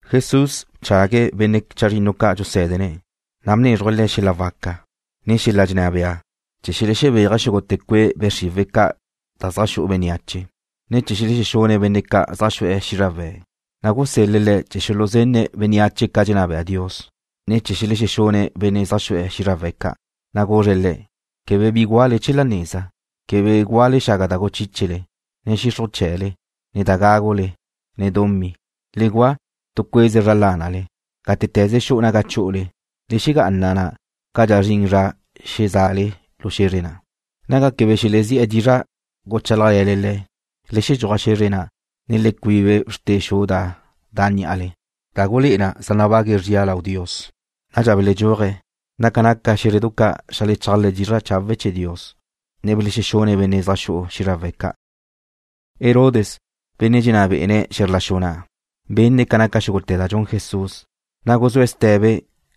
Jesús bchague̱' benne' chazrinnu ca' dxusé̱dene̱', na' bnézruje̱' le̱' xel-la waca, ne xel-la dxenná bea chee̱ xelexebéaje̱' xúgute̱ cue' be' xriwe̱' ca' da zaj xu'u bénneache, ne chee̱ xelexexune̱' benne' ca' zaj xu'e̱ xízrawe̱'. Na' gusel-le̱' le̱' chee̱ xuluzenne̱' bénneache ca dxenná bea Dios, ne chee̱ xelexexune̱' benne' zaj xu'e̱ xízrawe̱' ca'. Na' guzre̱' le̱': ―Quebe bi gúale chee̱ la neza. Quebe gúale xaga da guchíchele, na' xixruj chee̱le, ne da gágule, ne dumí. Le gua' tu cue'ze zra lánale. Gátete̱ze xu'u naga chú'ule, le xegá'ana na' cadxa zrin zra xeza'ale lu xe̱zre na'. Naga quebe xelezí'e̱ dizra' guchálajle̱le le̱', le xedxúaj xe̱zre na', ne le cuibe bxrte xu da da' ní'ale, da gulé'e na zaj nabague̱' zria lau Dios. Nadxa beledxúaje̱', na' ca naca xé̱zredu ca' xeajlechálaje̱' dizra' chawe' chee̱ Dios, ne belexexune̱' benne' zaj xu'e̱ xízrawe̱' ca'. Herodes, benne' dxenná be'ene̱' xe̱zr la xu na', benne̱' ca naca xúgute̱ da dxun Jesús, na' guzúe̱' ste̱be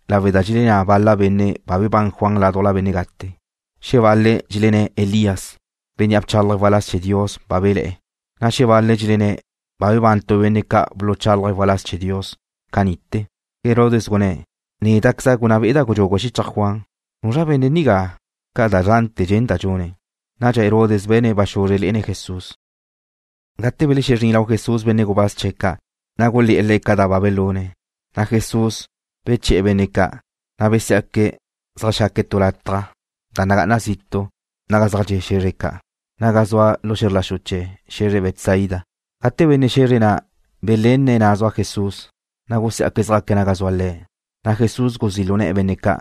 lawe' da dxelenná bal-la benne' ba bebán Juan ládujla benne' gate. Xebal-le̱' dxelenné̱' Elías, bénnea' bchálaje̱' waláz chee̱ Dios ba bele̱'e̱, na' xebal-le̱' dxelenné̱' ba bebán tu benne' ca' buluchálaje̱' waláz chee̱ Dios ca ni'te̱. Herodes gunné̱': ―Néda'queza' gunná be'eda' nu gudxugu xichaj Juan. ¿Nuzra benne' nigá xca' da zante̱ dxenda' dxune̱'? Nadxa Herodes be̱ne̱' ba xuzre lé'ene̱' Jesús. Gate belexezrín benne' gubáz ca' chee̱ Jesús lau Le̱', na' gulé̱'e̱ Le̱' ca da ba belune̱'. Na' Jesús beche̱'e̱ benne' ca', na' besiá'que̱' zeajxaque̱' tu lataj da nagá'ana zitu' naga zaj dxe' xe̱zre ca', naga zua lu xe̱zr la xu chee̱ xe̱zre Betsaida. Gate benne' xe̱zre na' belenne̱' zua Jesús na', na' gusiá'que̱' zjaque̱' naga zua Le̱'. Na' Jesús guzí' lu ne̱'e̱ benne' ca',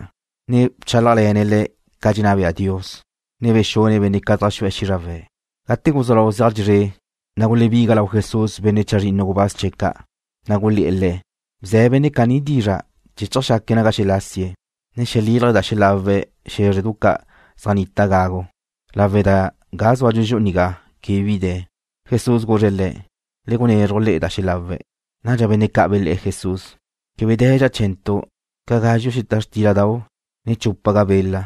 ne bchálajle̱ne̱' le̱' ca dxenná bea Dios, ne bexune̱' benne' zaj xu'e̱ xízrawe̱' ca'. Gate guzú lau zeaj dxezré', na' gulebiga benne' chazrinnu gubáz ca' chee̱ Jesús lau Le̱', na' gulé̱'e̱ Le̱': ―Bze̱ benne' caní dizra' chee̱ chjaque̱' naga xelasie̱', ne xelílaje̱' da xelawe̱' xé̱zredu ca' zaj nnita gagu, lawe' da ga zúadxu nigá quebe bi de̱. Jesús guzre̱' le̱': ―Le gunezruj le'e da xelawe̱'. Nadxa benne' ca' bele̱'e̱ Jesús: ―Quebe de̱dxa chee̱ntu' ca gázxuga xeta xtíladau', ne chúpaga bela,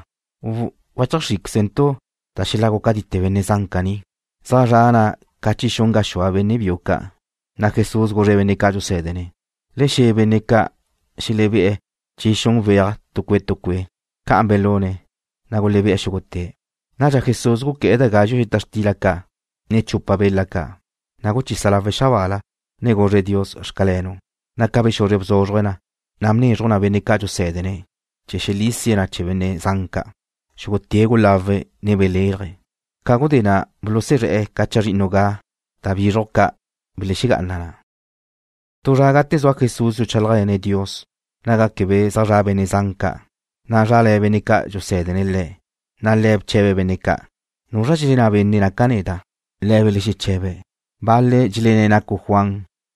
u ¿wacheajxríquezentu' da xelagu catite benne' zan caní? Zaj zra ca chi xun gaxúa benne' biu ca' ga na'. Nadxa Jesús guzre̱' benne' ca' dxusé̱dene̱': ―Le xe̱ benne' ca' xelebé'e̱ chi xun weaje̱' tu cue' tu cue'. Ca'an belune̱', na' gulebe'e̱ xúgute̱'. Nadxa Jesús guqué̱'e̱ da gazxu' xeta xtila ca', ne chupa bela ca'. Na' guchisa lawe̱' xabaala, ne guzre̱' Dios “Xcalenu'”, na' ca bexuzre bzúzruje̱' na, na' bnézruje̱' na benne' ca' dxusé̱dene̱' chee̱ xelisie̱' na chee̱ benne' zan ca'. Xúgute̱' gulawe̱', ne belélaje̱'. Ca gudé na' bulusuzré̱'e̱ chazrinnu ga' da bízrujdu ca' belexegá'ana na. Tu zra gate zua Jesús dxuchálajle̱ne̱' Dios naga quebe zaj zra benne' zan ca', na' zrale̱ benne' ca' dxusé̱dene̱' Le̱', na' Le̱' bche̱be̱' benne' ca': ―¿Nuzra dxelenná benne' naca' neda'? Le̱' belexeche̱be̱': ―Bal-le̱' dxelenné̱' nacu' Juan,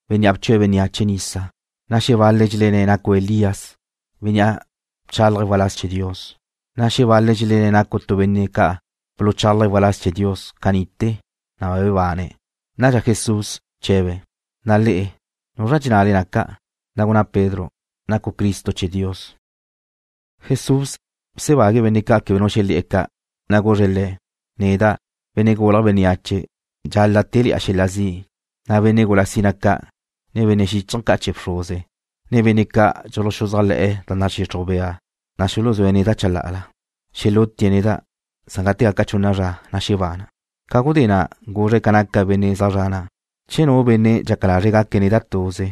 bénnea' bchue̱' bénneache nisa, na' xebal-le̱' dxelenné̱' nacu' Elías, bénnea' bchálaje̱' waláz chee̱ Dios, na' xebal-le̱' dxelenné̱' nacu' tu benne' ca' buluchálaje̱' waláz chee̱ Dios ca ni'ite̱, na' bebane̱'. Nadxa Jesús bche̱be̱': ―Na' le'e, ¿nuzra dxennale naca'? Na' gunná Pedro: ―Nacu' Cristo chee̱ Dios. Jesús bsebague̱' benne' ca' quebe nu xelé̱'e̱ ca'. Na' guzre̱' le̱': ―Neda', Benne' Gulje̱' Bénneache, dxal-la' téle̱'a xel-la zi', na' benne' gula sina ca', ne benne' xíchaje̱ ca' chee̱ bxruze, ne benne' ca' dxuluxuzájle̱'e̱ da nadxixruj bea na xuluzúe̱' neda' chalá'ala. Xelútie̱' neda', san gate gaca chunna zra, na' xebana'. Ca gudé na' guzre̱' ca naca benne' zaj zre̱'e̱ na': ―Che nu benne' dxaca lazre̱' gaque̱' neda' tuze,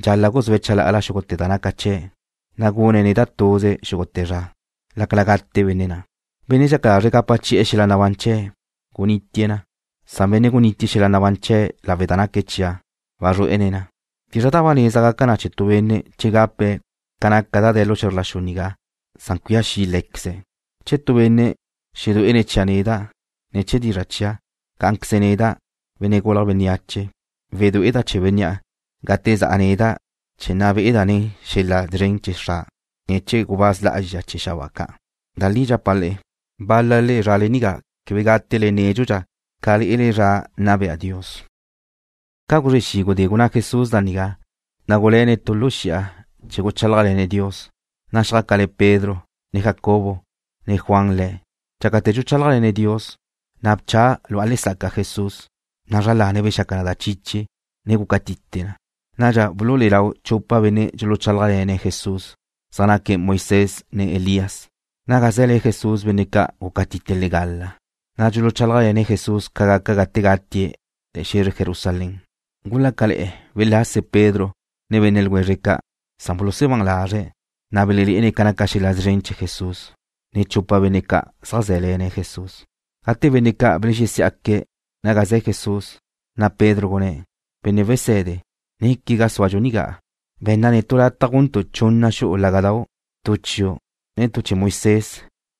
dxal-la' guzúe̱' chalá'ala xúgute̱ da naca chee̱', na' gune̱' neda' tuze xúgute̱ zra, lácala gate benne' na'. Benne' dxaca lazre̱' gapa chi'e̱ xel-la nabán chee̱', gunítie̱' na, san benne' gunítie̱' xel-la nabán chee̱' lawe' da naque̱' chia', wazrué'ene̱' na. ¿Bizra da ba neza gaca na chee̱ tu benne' che gape̱' ca naca da de̱ lu xe̱zr la xu nigá, san cuía xi' lé̱queze̱'? Che nu benne' xedué'ene̱' chia' neda', ne chee̱ dizra' chia', cá'anqueze neda', Benne' Gulje̱' Bénneache, wedué'eda' chee̱ bénnea' gate za'a neda' chee̱ nna be'a nen xel-la szren chee̱ Xra', ne chee̱ gubáz lá'azxa chee̱ xabáa ca'. Da li dxapa' le'e, bál-lale zrale nigá quebe gátele nédxudxa ca lé'ele zra nna bea Dios. Ca guzre xi' gudé gunná Jesús da nigá, na' guluéne̱' tu lu xi'a chee̱ guchálajle̱ne̱' Dios, na' xjácale̱ Pedro, ne Jacobo, ne Juan Le̱'. Dxácate̱ dxuchálajle̱ne̱' Dios, na' bcha lu'a lesaca Jesús, na' zra lane̱' bexaca na da chiche, ne guca tite na. Nadxa bululé'e lau chupa benne' dxuluchálajle̱ne̱' Jesús. Zaj naque̱' Moisés ne Elías. Naga ze̱le̱ Jesús benne' ca' gúcatite' legala, na' dxuluchálajle̱ne̱' Jesús ca gaca gate gatie̱' Le̱' xe̱zre Jerusalén. Gulácale̱'e̱ welase Pedro ne benne' ljwezre̱' ca', san bulusebán lazre̱', na' belelé'ene̱' ca naca xel-la szren chee̱ Jesús, ne chupa benne' ca' zaj zé̱le̱ne̱' Jesús. Gate benne' ca' belexesiá'que̱' naga ze̱ Jesús, na' Pedro gunné̱': ―Benne' Wese̱de, néquega zúadxu nigá. Be̱nna netu' lataj guntu' chunna xu'u lága'dau', tu chiu', ne tu chee̱ Moisés,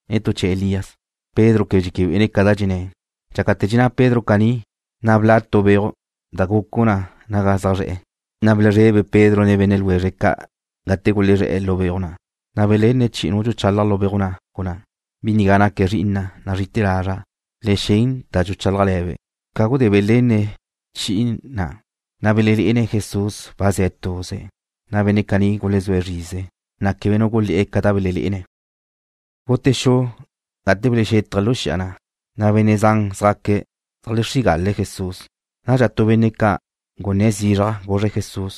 ne tu chee̱ Elías. Pedro quebe dxéquebe'ene̱' ca da dxenné̱'. Dxácate̱ dxenná Pedro caní, na' bla' tu beuj da gucu na naga zaj zre̱'e̱, na' belezrebe Pedro, ne benne' ljwezre̱' ca' gate gulezré̱'e̱ lu beuj na'. Na' belenne̱' chi'i nu dxuchalaj lu beuj na', gunná: ―Bi nigá naque̱' Zri'ina', nazrí'ite̱ lazra'. Le xen da dxuchálajbe'. Ca gudé belenne̱' chi'i na', na' belelé'ene̱' Jesús ba ze̱' tuze̱'. Na' benne' caní gulezúe̱' zrize, na' quebe nu gulé̱'e̱ ca da belelé'ene̱'. Gute xu, gate belexexétaje̱' lu xi'a na', na' benne' zan zjaque̱' zeajlexrígale̱' Jesús. Nadxa tu benne' ca' gunné̱' zizraj, guzre̱' Jesús: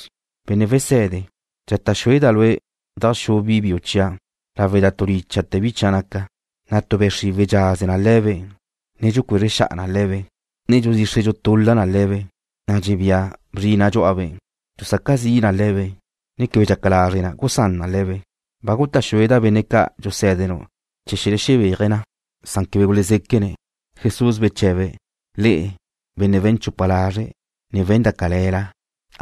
―Benne' Wese̱de, dxata' xueda' Lue' dajxú' bi biu chia' lawe' da tu lícha'te̱ bi chia' naca, na' tu be' xriwe̱' dxaze na le̱be', ne dxucuezre xa'a na le̱be', ne dxudxixre dxutula na le̱be', na' dxebía bzrina' dxú'abe'. Dxusaca zi na le̱be', ne quebe dxaca lazre' na gusán na le̱be'. Ba guta' xueda' benne' ca' dxusé̱denu' chee̱ xelexebéaje̱' na, san quebe gulezéquene̱'. Jesús beche̱be̱': ―Le'e, benne' we̱n chupa lazre', ne we̱n da cale̱la.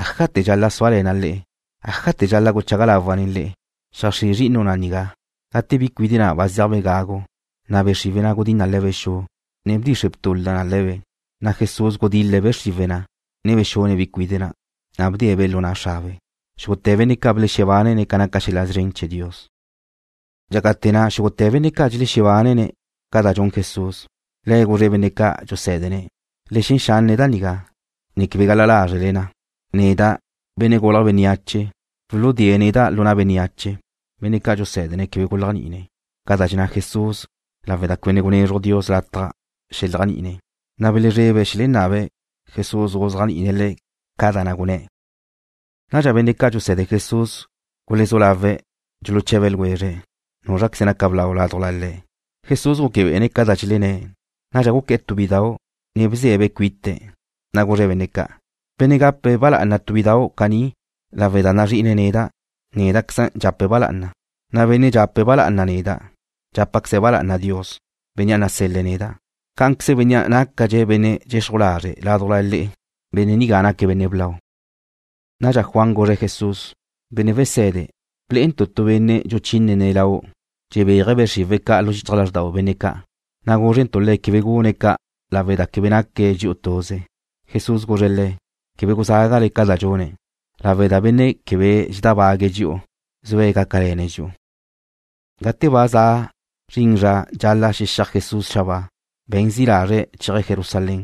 ¿Ájate̱ dxal-la' súale̱na' le'e? ¿Ájate̱ dxal-la' guchaga lawa' nen le'e? Xeajxrí' zri'inu' na' nigá. Gate bi cuide' na' ba zéajbe' gagu, na' be' xriwe̱' na' gudín na le̱be' xu, ne bdxixre btula na le̱be'. Na' Jesús gudil-le̱' be' xriwe̱' na', ne bexune̱' bi cuide' na', na' bdee̱'-be' lu na' xrabe'. Xúgute̱ benne' ca' belexebánene̱' ca naca xel-la szren chee̱ Dios. Dxácate̱ na' xúgute̱ benne' ca' dxelexebánene̱' ca da dxun Jesús, Le̱' guzre̱' benne' ca' dxusé̱dene̱': ―Le xen xanne' da nigá, ne quebe gal-la lázrele na. Neda', Benne' Gulje̱' Bénneache, wuludée̱' neda' lu na' bénneache. Benne' ca' dxusé̱dene̱' quebe guléajni'ine̱' ca da dxenná Jesús lawe' da quebe ne gunézruj Dios lataj xeléajni'ine̱', na' belezrebe̱' xelenabe̱' Jesús guzéajni'ine̱' le̱' ca da na' gunné̱'. Nadxa benne' ca' dxuse̱de Jesús gulezú lawe̱' dxuluche̱be ljwezre̱' núzraqueze naca blau ládujla le̱'. Jesús gúquebe'ene̱' ca da dxelenné̱'. Nadxa guqué̱'e̱ tu bi biúdau', ne bze̱'-be' cuite̱', na' guzre̱' benne' ca': ―Benne' gape̱' ba lá'ana tu bidu caní lawe' da nazrí'ine̱' neda', néda'queza' dxape̱' ba lá'ana, na' benne' dxape̱' ba lá'ana neda', dxápaqueze̱' ba lá'ana Dios, Bénnea' nasel-le̱' neda'. Cá'anqueze bénnea' nácadxe̱' benne' dxexruj lazre' ládujla le'e, benne' nigá naque̱' benne' blau. Nadxa Juan guzre̱' Jesús: ―Benne' Wese̱de, blé'entu' tu benne' dxuchínene̱' Lau', dxebéaje̱' be' xriwe̱' ca' lu xichaj lázrdau benne' ca', na' gúzrentu' le̱' quebe gune̱' ca' lawe' da quebe naque' dxi'u tuze. Jesús guzre̱' le̱': ―Quebe guzágale ca da dxune̱' lawe' da benne' quebe dxedábague̱' dxi'u zue̱' gácale̱ne̱' dxi'u. Gate ba za zrin zra dxal-la' xexíaj Jesús xabáa, be̱n zi' lazre̱' chéaje̱' Jerusalén.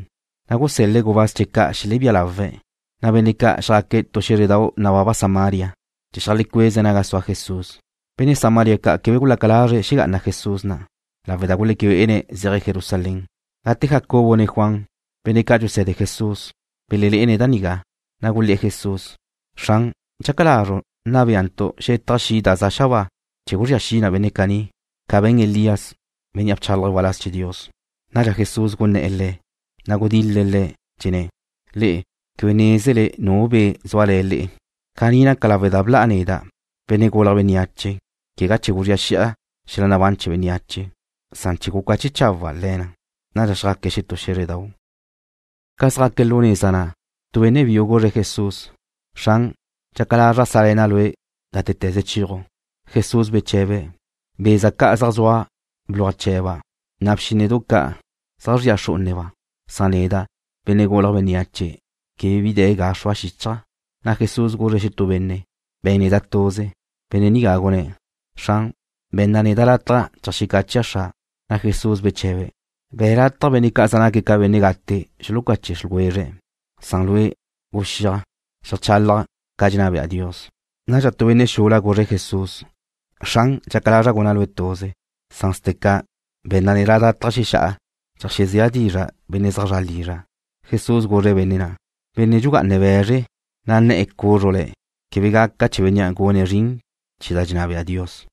Na' gusél-le̱' gubáz chee̱' ca' xelebía lawe̱', na' benne' ca' xjaque̱' tu xé̱zredau' nababa Samaria chee̱ cheajlecuéze̱' naga sua Jesús. Benne' Samaria ca' quebe gulaca lazre̱' xegá'ana Jesús na', lawe' da guleque bé'ene̱' zéaje̱' Jerusalén. Gate Jacobo ne Juan, benne' ca' dxuse̱de Jesús, belelé'ene̱' da nigá, na' gulé̱'e̱ Jesús: ―Xran, ¿dxaca lazru' nna béantu' xetaj xi' da za xabáa chee̱ guzría xi na benne' caní, ca be̱n Elías, bénnea' bchálaje̱' waláz chee̱ Dios? Nadxa Jesús guné̱'e̱ le̱', ne gudil-le̱' le̱', dxenné̱': ―Le'e quebe nézele nu be' zúale̱ le'e. Caní naca lawe' da bla' neda', Benne' Gulje̱' Bénneache, quegá chee̱ guzría xi'a xel-la nabán chee̱ bénneache, san chee̱ gucache chawa' le̱ na. Nadxa xjaque̱' xetú xé̱zredau'. Ca zjaque̱' lu neza na', tu benne' biu guzre̱' Jesús: ―Xran, dxaca lazra' sále̱na' Lue' gátete̱ze chéaju'. Jesús beche̱be̱': ―Beza ca' zaj zua bluaj chee̱ba', na' bxínnedu ca' zaj zria xrú'uneba', san neda', Benne' Gulje̱' Bénneache, quebe bi de̱ ga xrua xíchaja'. Na' Jesús guzre̱' xetú benne': ―Be̱n neda' tuze. Benne' nigá gunné̱': ―Xran, be̱nna neda' lataj cheajcáchea' xra'. Na' Jesús beche̱be̱': ―Be̱ lataj benne' ca' zaj naque̱' ca benne' gate xulucache' ljwezre̱', na' lue', guxíaj, xeajchalaj ca dxenná bea Dios. Nadxa tu benne' xula guzre̱' Jesús: ―Xran, dxaca lazra' guna' Lue' tuze, san steca, be̱nna neda' lataj xexá'a cheajzéa' dizra' benne' zaj zra' lizra'. Jesús guzre̱' benne' na': ―Benne' dxugá'ane̱' be̱zre, na' nne̱'e̱ cúzrule̱', quebe gaca chee̱ bénnea' gune̱' zrin chee̱ da dxenná bea Dios.